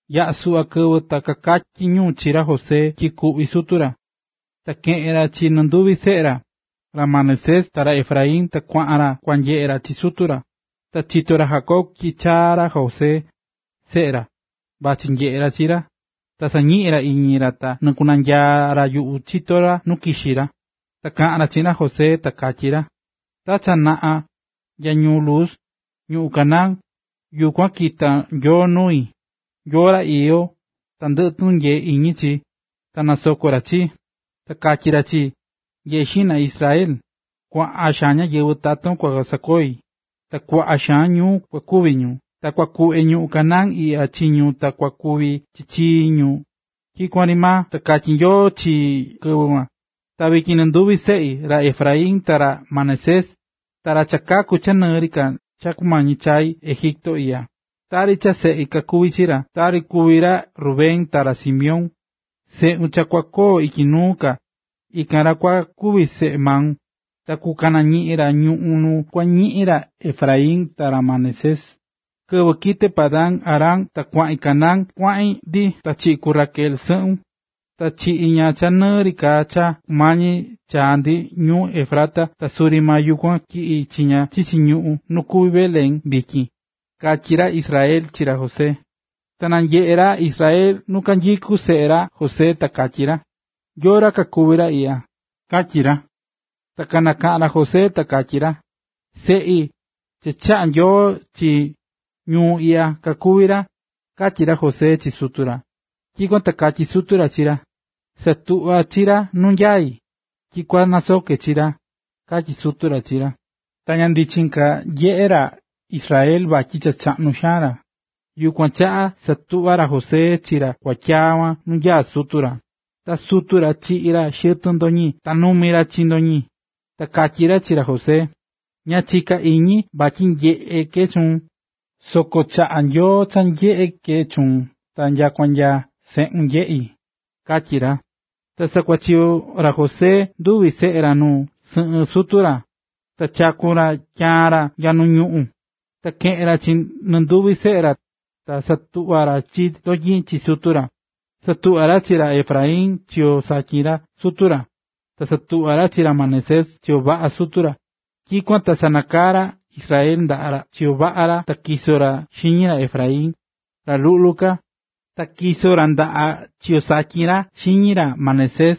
Yaꞌa̱ suꞌva kɨvɨ ta kakatyí ñu chi ra José tyi kuꞌví sutu ra. Ta keꞌe̱n ra chi nɨnduvi seꞌe ra, ra Manasés ta ra Efraín ta kuaꞌan ra kua nyeꞌe ra chi sutu ra. Cha chitó ra Jacob tyi chaa̱ ra José, seꞌe ra, vachí nyeꞌe ra chi ra, ta sañiꞌín ra iñi ra ta nɨkunyaa̱ ra yuꞌu chito nu kixí ra. Ta kaꞌa̱n ra chiꞌin ra José, ta katyí ra: ―Ta cha naꞌa nya ñuu Luz, ñuꞌún Canaán, yukuan kita̱ Nyoo nui, Nyoo ra iyó tandɨꞌɨ tunyee iñi chi, ta nasoko̱ ra chii. Ta katyi̱ ra chii: “Nye̱ꞌe xiꞌna Israel, kuaꞌa xaan ñáyɨvɨ taton kua sakoi, ta kuaꞌa xaan ñuu kua kuvi ñu, ta kua kuꞌve ñuꞌún Canaán iꞌya chi ñu ta kua kuvi chi chii ñu tyikuan ri maa”, katyi̱ Nyoo chii kɨvɨ kuan. Ta vityin nɨnduvi seꞌun, ra Efraín ta ra Manasés, ra cha kakaku̱ cha nɨɨ ri ka cha kumañi ka chai Egipto iꞌya, tari cha seꞌi kakuví chi ra, tari kuví ra Rubén ta ra Simeón. Seꞌun cha kua koo ityi nuu ka, ikan ra kuan kua kuvi seꞌe maun, ta kukañiꞌin ra ñuꞌún nu kua ñiꞌin ra Efraín ta ra Manasés. Kɨvɨ kite̱ Padan-aram ta kuaꞌin Canaán, ityi kuaꞌan ndi ta chiꞌi̱ ku Raquel sɨꞌun, chiꞌi̱ ña cha nɨɨ ri ka cha kumañi chaa ndi ñuu Efrata ta suri maa yukuan tyiꞌi̱ chi ña chichi ñuꞌún nu kuví Belén vityin ―katyí ra Israel chi ra José. Ta nanyeꞌe̱ ra Israel nu kanyikú seꞌe ra José ta katyí ra: ―¿Yóó ra kakuví ra iꞌya? ―katyí ra. Ta nakaꞌan ra José ta katyí ra: ―Seꞌi, cha chaꞌa̱ Nyoo chii ñuu iꞌya, kakuví ra ―katyí ra José chi sutu ra. Tyikuan ta katyí sutu ra chi ra: ―Sa̱tuꞌva chi ra nu nyaí, tyi kua nasoke chi ra ―katyí sutu ra chi ra. Ta ña ndichin ka nyeꞌé ra Israel vatyi cha chaꞌnu xaan ra. Yukuan chaꞌa satuꞌva̱ ra José chi ra kuatyaa kuan nu nyaá sutu ra. Ta sutu ra chiꞌí ra xɨtɨn ndotyin ta numi ra chi ndotyin. Ta katyí ra chi ra José: ―Ña chika̱ iñi vatyi nyeꞌé ke chuun, soko chaꞌa̱ Nyoo cha nyeꞌé ke chuun ta nyakua nya seꞌun nyeꞌí ―katyí ra. Ta sakuachiyo̱ ra José nduvi seꞌe ra nu sɨꞌɨn sutu ra, ta chaku̱n ra tyaan ra nya nu ñuꞌún. Ta keꞌe̱n ra chi nɨnduvi seꞌe ra, ta satuꞌva̱ ra chi ndotyin chi sutu ra. Satuꞌva̱ ra chi ra Efraín chiyo satyin sutu ra, ta satuꞌva̱ ra chi ra Manasés chiyo vaꞌa sutu ra. Tyikuan ta sanakaa̱ ra Israel ndaꞌa chiyo vaꞌa ra ta tyiso̱ ra xiñi ra Efraín, ra luꞌlu ka, ta tyiso̱ ra ndaꞌa chiyo satyin ra xiñi ra Manasés,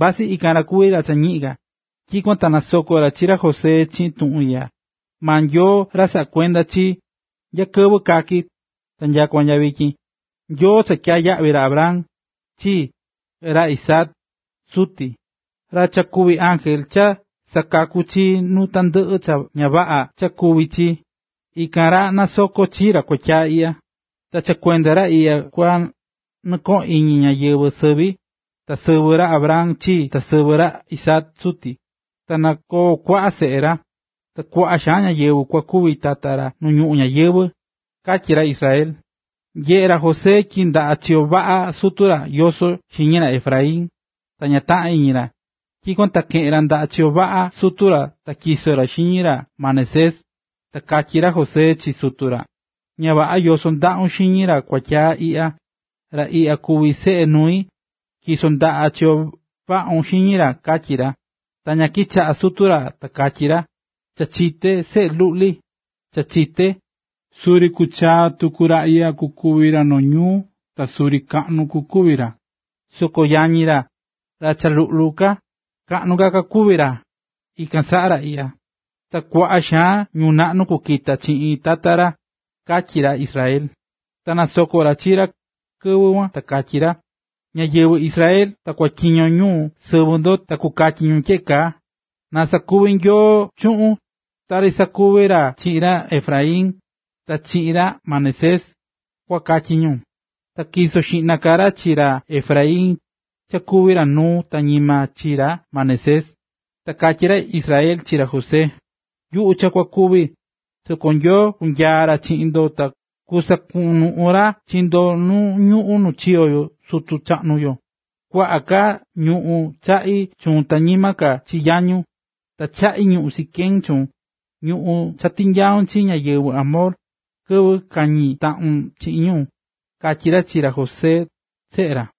vasɨ ikan ra kuví ra cha ñiꞌin ka. Tyikuan ta nasoko̱ ra chi ra José chiꞌin tuꞌun iꞌya: “Maa Nyoo, ra saꞌá kuenda chii, nya kɨvɨ kaki̱ ta nyakua nya vityin, Nyoo cha tyaa̱ yaꞌvi ra Abraham, chii, ta ra Isaac, suti, ra cha kuví Ángel cha sakakú chii nuu tandɨꞌɨ cha ña vaꞌa cha kuvi̱ chii, ikan ra na nasoko chi ra kuatyi iꞌya. Ta cha kuenda ra iꞌya kua nɨkoꞌon iñi ñáyɨvɨ sɨvi, ta sɨvɨ ra Abraham, chii, ta sɨvɨ ra Isaac, suti. Ta na koo kuaꞌa seꞌe ra, ta kuaꞌa xaan ñáyɨvɨ kua kuvi tata ra nu ñuꞌún ñayɨvɨ̱”, katyí ra Israel. Nyeꞌe̱ ra José tyi ndaꞌa chiyo vaꞌa sutu ra yosó xiñi ra Efraín, ta ña taꞌa̱n iñi ra; tyikuan ta keꞌe̱n ra ndaꞌa chiyo vaꞌa sutu ra ta natyiso̱ ra xiñi ra Manasés. Ta katyí ra José chi sutu ra: ―Ña vaꞌa yosó ndaꞌun xiñi ra kua tyaa iꞌya, ra iꞌya kuví seꞌe nui, tyi̱so ndaꞌa chiyo vaꞌun xiñi ra ―katyí ra. Ta ña kichaꞌa sutu ra ta katyí ra: ―Cha chité seꞌe luꞌli, cha chité. Suri kuchaa tuku ra iꞌya kuvi ra noo ñuu ta suri kaꞌnu kukuvi ra, soko yañi ra, ra cha luꞌlu ka, kaꞌnu ka kukuvi ra ikan saꞌa ra iꞌya, ta kuaꞌa xaan ñuu naꞌnu kukita chiꞌin tata ra ―katyí ra Israel. Ta nasoko̱ ra chi ra kɨvɨ kuan ta katyí ra: ―Ñáyɨvɨ Israel ta kukotyiño ñu sɨvɨ ndo ta kukatyi ñu tyeꞌe kaa: “Na sakuvi Nyoo chuꞌun, tari sakuvi̱ ra chiꞌin ra Efraín ta chiꞌin ra Manasés”, kua katyí ñu. Ta tyiso̱ xiꞌna ka ra chi ra Efraín cha kuvi ra nuu ta ñima chi ra Manasés. Ta katyí ra Israel chi ra José: ―Yuꞌu, cha kua kúvi, soko Nyoo kunyaa ra chiꞌin ndo ta kusakunuꞌun ra chi ndo nu ñuꞌún nu chiyo̱ sutu chaꞌnu yo. Kuaꞌa ka ñuꞌún chaꞌí chuun ta ñima ka chi yañun. Ta chaꞌí ñuꞌún Siquem chuun, ñuꞌún cha tinyai̱ chi ñáyɨvɨ Amor, kɨvɨ kañi̱ taꞌin chiꞌin ñu ―katyí ra chi ra José, seꞌe ra.